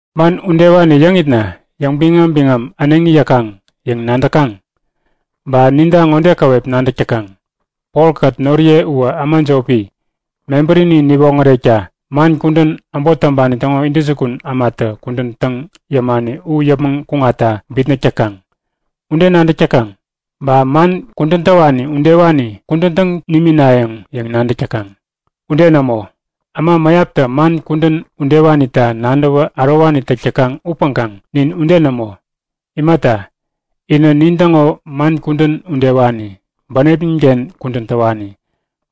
Man udewani yäŋitna yäŋbiŋam-biŋam äneŋi yäkaŋ yäŋ nadäkaŋ? Ba ninta ŋode käwep nadäk täkaŋ; Polkät noriye uwä äma jopi. Mebärini niwoŋärekta man kudän äbot täŋpani täŋo intäjukun ämatä kudän täŋ yämani u yäpmäŋ kuŋatta bitnäk täkaŋ. Ude nadäk täkaŋ? Ba man kudän täwani udewani kudän täŋ niminayäŋ yäŋ nadäkaŋ? Ude nämo! Äma mäyaptä man kudän udewanita nadäwä ärowani täk täkaŋ upäŋkaŋ nin ude nämo. Imata, inä nintäŋo man kudän udewani, bänepnin-ken kudän täwani.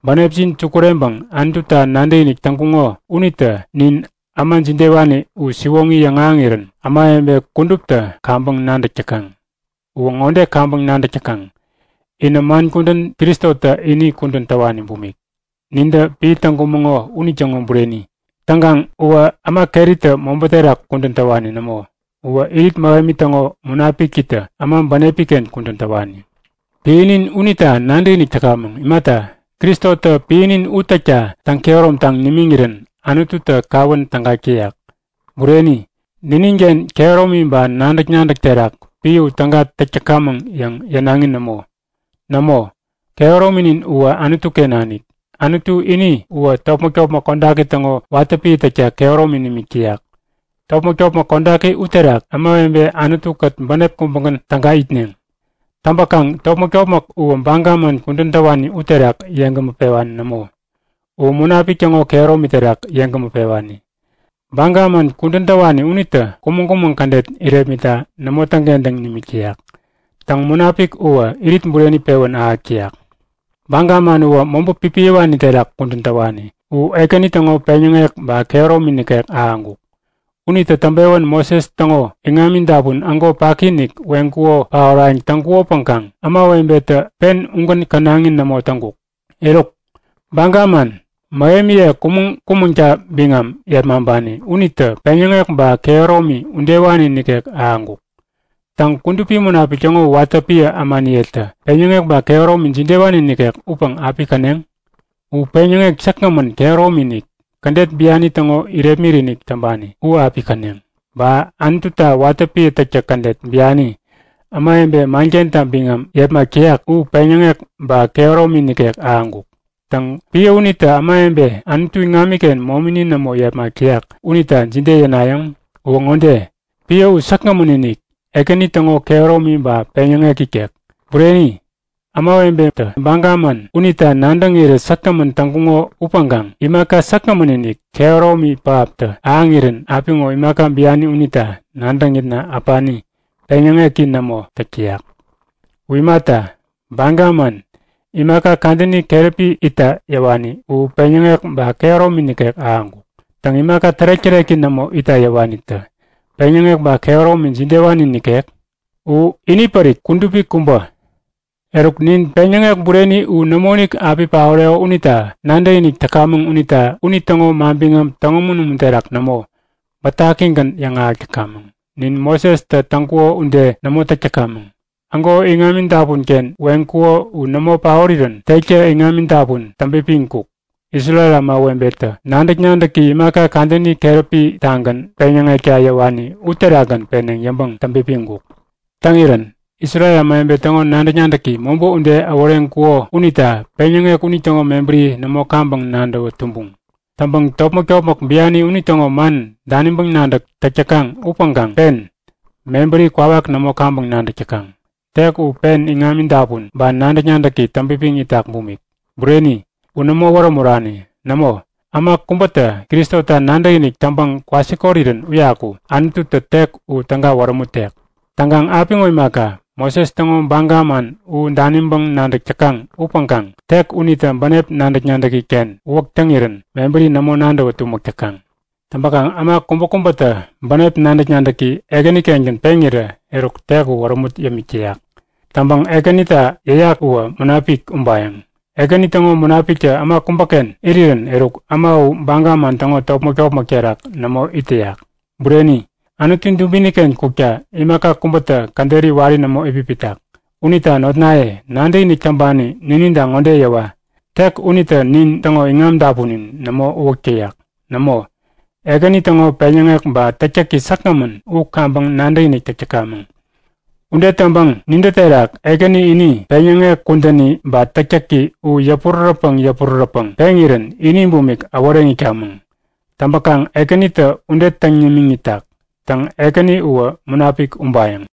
Bänepjin sukureŋpäŋ Anututa nadäkinik täŋkuŋo unitä nin äma jidewani u siwoŋi yäŋahäŋirän ämawebe kuduptä kaŋpäŋ nadäk täkaŋ. Uwä ŋode kaŋpäŋ nadäk täkaŋ; Inä man kudän Kristotä ini kudän täwani bumik, nintä piä täŋkumäŋo unitäŋo bureni. Täŋkaŋ uwä äma keritä mobä terak kudän täwani nämo, uwä Irit Mähemi täŋo Munapikitä äma bänepi-ken kudän täwani. Piänin unita nadäkinik täkamäŋ. Imata, Kristotä piäni u täkta täŋ-kehäromtaŋ nimiŋirän Anututä kawän tägak täyak. Bureni, nininken kehäromi ba nadäk-nadäk terak piä u täga täk täkamäŋ yäŋ yänaŋi nämo. Nämo, kehärominin uwä Anutu-ken nanik. Anutu ini uwä topmäk-topmäk kodaki täŋo watä piä täkta kehäromi nimik täyak. Topmäk-topmäk kodaki uterak ämawebe Anutu-kät bänep kubägän täga itneŋ. Täŋpäkaŋ topmäk-topmäk uwä baga man kudän täwani uterak yeŋgämä pewani nämo, u Munapik täŋo kehäromi terak yeŋgämä pewani. Baga man kudän täwani unitä kumäŋ-kumäŋ kädet irepmitta nämo täŋkentäŋ nimik täyak. Täŋ, Munapik uwä irit bureni pewän ahäk täyak. Baga man uwä mobä pipiyäwani terak kudän täwani u Ekäni täŋo peŋyäŋek ba kehäromi nikek ahäŋkuk. Unitä täŋpewän Moses täŋo iŋami-dapun ägo paki-inik weŋkuko paorayäŋ täŋkukopäŋkaŋ ämawebetä pen ugän känaŋi nämo täŋkuk. Eruk, baga man, mähemiye kumäŋ-kumäŋta biŋam yepmaŋpani unitä peŋyäŋek ba kehäromi udewani nikek ahäŋkuk. Täŋ Kudupi Munapik täŋo watä piä ämaniyetä peŋyäŋek ba kehäromi jidewani nikek upäŋ api käneŋ? U peŋyäŋek säkgämän kehäromi-inik, kädet biani täŋo irepmit-inik täŋpani u api käneŋ! Ba Anututa watä piä täktäk kädet biani, ämawebe mankenta biŋam yepmak täyak u peŋyäŋek ba kehäromi nikek ahäŋkuk. Täŋ piä unitä ämawebe Anutu iŋamiken momini nämo yepmak täyak unita jide yänayäŋ? Uwä ŋode; Piä u säkgämän-inik, Ekäni täŋo kehäromi ba peŋyäŋek ikek! Bureni, ämawebetä baga man unita nadäŋirä säkgämän täŋkuko upäŋkaŋ imaka säkgämän-inik, kehäromi pähaptä ahäŋirän apiŋo imaka biani unita nadäŋitna äpani, peŋyäŋeki nämo täk täyak. U imata, baga man, imaka kadäni keräpi itta yäwani u peŋyäŋek ba kehäromi nikek ahäŋkuk. Täŋ imaka tärek-täreki nämo itta yäwanitä peŋyäŋek ba kehäromi jidewani nikek? U inipärik kudupi kubä! Eruk nin peŋyäŋek bureni u nämoinik api paoreko unita nadäkinik täkamäŋ unita unitäŋo manbiŋam täŋumun-umun terak nämo, bätakigän yäŋahäk täkamäŋ. Nin Mosestä täŋkuko ude nämo täk täkamäŋ. Ägo iŋami dapun-ken weŋkuko u nämo paorirän tektä iŋami-dapun täŋpipiŋkuk, Isrel ämawebetä nadäk-nadäki imaka kadäni keräpi-tagän peŋyäŋekta yäwani uterakgän peneŋ yäŋpäŋ täŋpipiŋkuk. Täŋirän Isrel ämawebe täŋo nadäk-nadäki mobä ude äworeŋkuko unita peŋyäŋek unitäŋo mebäri nämo kaŋpäŋ nadäwä tumbuŋ. Täŋpäŋ topmäk-topmäk biani unitäŋo man daniŋpäŋ nadäk täk täkaŋ upäŋkaŋ pen, mebäri kwawak nämo kaŋpäŋ nadäk täkaŋ. Tek u pen iŋami-dapun ba nadäk-nadäki täŋpipiŋ itak bumik. Bureni, u nämo wärämurani. Nämo, äma kubätä Kristota nadäkinik täŋpäŋ kwasikorirän uyaku Anututä tek u täga wärämutek. Täŋkaŋ apiŋo imaka, Moses täŋo baga man u daniŋpäŋ nadäk täkaŋ upäŋkaŋ tek unitä bänep nadäk-nadäki-ken uwäk täŋirän mebäri nämo nadäwä tumäk täkaŋ. Täŋpäkaŋ äma kubäkubätä bänep nadäk-nadäki Ekänikengän peŋirä eruk tek u wärämut yämik täyak. Täŋpäŋ Ekänita yäyak uwä Munapik ubayäŋ. Ekäni täŋo Munapiktä äma kubäken irirän eruk äma u baga man täŋo topmäk-topmäk terak nämo it täyak. Bureni, Anutu dubini-ken kukta imaka kubätä käderi wari nämo itpipitak. Unita notnaye, nadäkinik täŋpani nininta ŋode yäwa; Tek unitä nintäŋo iŋam-dapunin nämo uwäk täyak. Nämo, Ekäni täŋo peŋyäŋek ba täktäki säkgämän u kaŋpäŋ nadäkinik täk täkamäŋ. Ude täŋpäŋ nintä terak Ekäni ini peŋyäŋek kudäni ba täktäki u yäpurärätpäŋ yäpurärätpäŋ peŋirän ini bumik äworeŋ itkamäŋ. Täŋpäkaŋ Ekänitä ude täŋ nimiŋ itak. Täŋ Ekäni uwä Munapik ubayäŋ.